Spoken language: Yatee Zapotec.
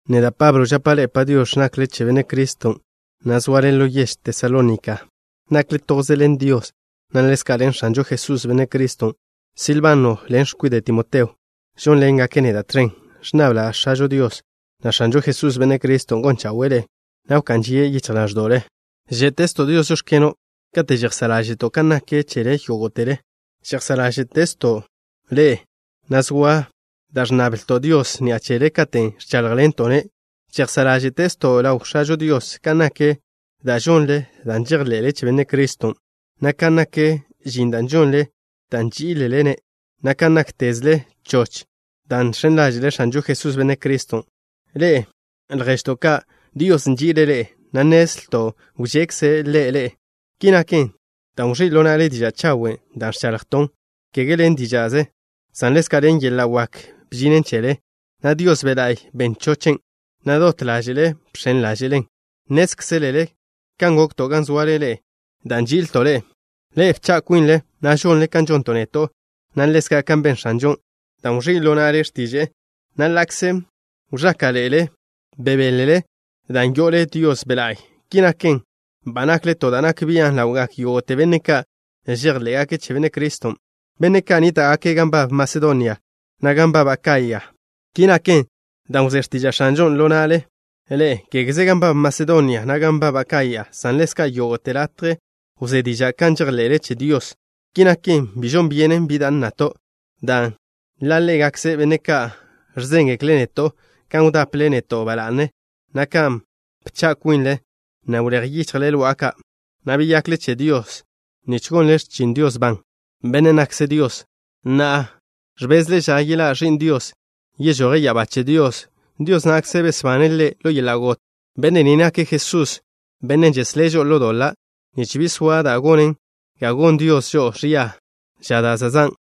Neda', Pablo, žapa' ḻe'e “Padiox̱”, nakle che Benne' Criston', na' zoale ḻo yež Tesalónika. Nakle toze ḻen Dios, na' ḻezka' ḻen X̱anžo Jesús, Benne' Criston'. Silbano ḻen x̱kwide' Timoteo žónḻengake' neda' tẕen. Ẕnnabla' X̱ažo Dios, na' X̱anžo Jesús, Benne' Criston', gon chawe'e ḻe'e, na' wká'n žie' yichj ḻáẕdo'le. Žé'tezto' Dios: “Žóx̱keno'” kate' žejsá' ḻáže'to' kan nak chele yógo'tele. Žejsá' ḻáže'tezto' ḻe'e, na' zoa da' ẕnnablto' Dios ni'a chele katen' ẕcháḻjḻento'-ne'. Žejsá' ḻáže'tezto' ḻaw X̱ažo Dios kan nak da' žonle dan' žejḻe'le che Benne' Criston', na' kan nak žin da' žonle dan' nží'ilele-ne', na' kan náktezle choch dan' žx̱en ḻáže'le X̱anžo Jesús, Benne' Criston'. Ḻe'e, lježto' ka', Dios nži'ile' ḻe'e, na' nnezlto' wžekze' Ḻe' ḻe'e. Ki naken dan' wẕí' ḻo na'le diža' chawen', da' ẕchaḻjton'. Kege ḻen díža'ze, san ḻezka' ḻen yeḻa' wak bžinen chele, na' Dios Be' La'y ben chochen', na' dot ḻáže'le bx̱en ḻáže'len. Nnézkzelele kan gokto' gan zoale ḻe'e dan' nži'ilto' ḻe'e. Ḻe'e bcha' kwinle, na' žonle kan žonto' neto', na' ḻezka' kan ben X̱anžon', dan' wẕí' ḻo na'le x̱tiže'e, na' ḻa'kze wẕáka'ḻe'ele, bebélele dan' yo'ole Dios Be' La'y. Ki naken, ba nakle to da' nak bian' ḻawgak yógo'te benne' ka' žejḻé'gake' che Benne' Criston', benne' ka' nníta'gake' gan nbab Masedonia, na' gan nbab Akaya. Ki naken dan' wzé x̱tiža' X̱anžon' ḻo na'le ḻe'e. Kégeze gan nbab Masedonia, na' gan nbab Akaya, san ḻezka' yógo'te latje wzé diža' kan žejḻe'le che Dios. Ki naken, bi žon byenen bi da' nnato', dan' ḻa' ḻégakze benne' ka' ẕzéngekle' neto' kan wdaple neto' ba la'ne, na' kan bcha' kwinle, na' wléj yichjle lo'a ka', na' beyakle che Dios nich gonle x̱chin Dios ban, Bennen' nakkze' Dios. Na'a, ẕbezle ža yeḻá' Ẕi'n Dios, yežoje' ya'abá che Dios. Dios na'kze besbane' Ḻe' ḻo yeḻa' got. Benne' ni nake' Jesusen', Bennen' žeslé' žo'o ḻo doḻa', nich bi soa da' gonen ga gon Dios žo'o ẕia ža da' zan'.